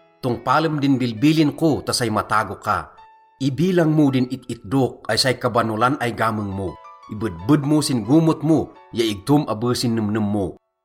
Tongpalem din bilbilin ko ta say matago ka. Ibilang mo din it-itdok ay say kabanolan ay gameng mo. Ibedbed mo sin gomot mo ya igtom abe sin nemnem mo.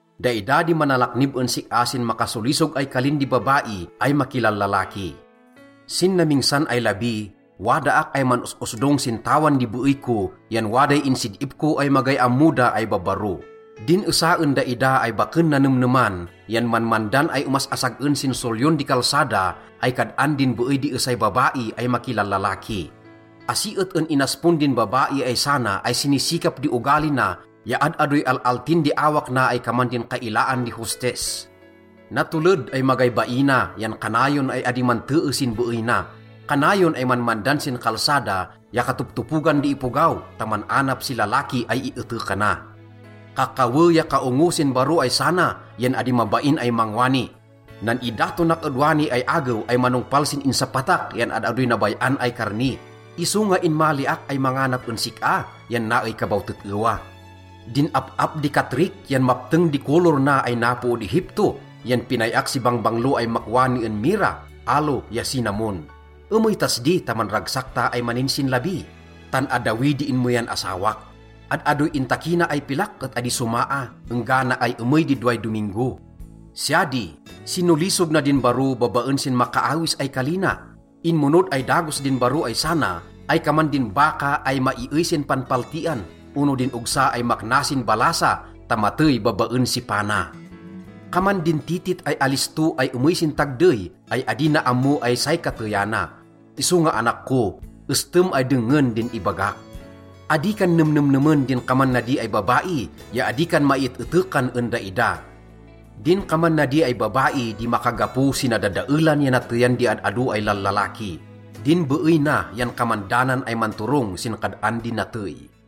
Daida di manalaknib en sik-a sin makasolisog ay kalin di babai ay makilallalaki. Sin namingsan ay labi, wadaak ay man-os-osdong sin tawan di beey ko yan waday insid-ip ko ay magay ammo da ay babbaro. Din esa en daida ay baken nanemneman yan manmandan ay omas-asag-en sin solyon di kalsada ay kad-an din beey di esay babai ay makilallalaki. Asi et en inaspon din babai ay sana ay sinisikap di ogali na ya ad-adoy al-altin di awak na ay kaman din kailaan di hostess. Natoled ay magay baina yan kanayon ay adi mantee sin beey na. Kanayon ay manmandan sin kalsada ya katoptopogan di ipogaw ta man-anap si lalaki ay ietekana. Kakawe ya kaongo sin baro ay sana yan adi mabain ay mangwani, “Nan-idatonak ed wani ay agew ay manongpal sin insapatak yan ad-adoy nabay-an ay karni. Isonga inmaliak ay manganap en sik-a yan naey ka baw tet-ewa. Din ap-ap di katrik yan mapteng di kolor na ay napo ed Egipto, yan pinay-ak si bangbanglo ay makwani en mirra, aloe ya cinnamon. Emey tas di ta manragsak ta ay maninsinlabi. Tan addawi di inmeyan asawak. Ad-adoy intakina ay pilak et adi somaa enggana ay emey di doway dominggo.” Siya di, sinolisog na din baro babaen sin makaawis ay kali na. Inmonod ay dagos din baro ay sana ay kaman din baka ay maiey sin panpaltian ono din ogsa ay makna sin ballasa ta matey babaen si pana. Kaman din titit ay alisto ay emey sin tagdey ay adi na ammo ay say kateyana. Isonga anak ko, estem ay dengngen din ibagak. Adi kan nemnemnemen din kaman nadi ay babai ya adi kan maiet-etekan en daida. Din kaman nadi ay babai di makagapo si nadadaelan ya nateyan di ad-ado ay lallalaki. Din beey na yan kaman danan ay manturong sin kad-an di natey.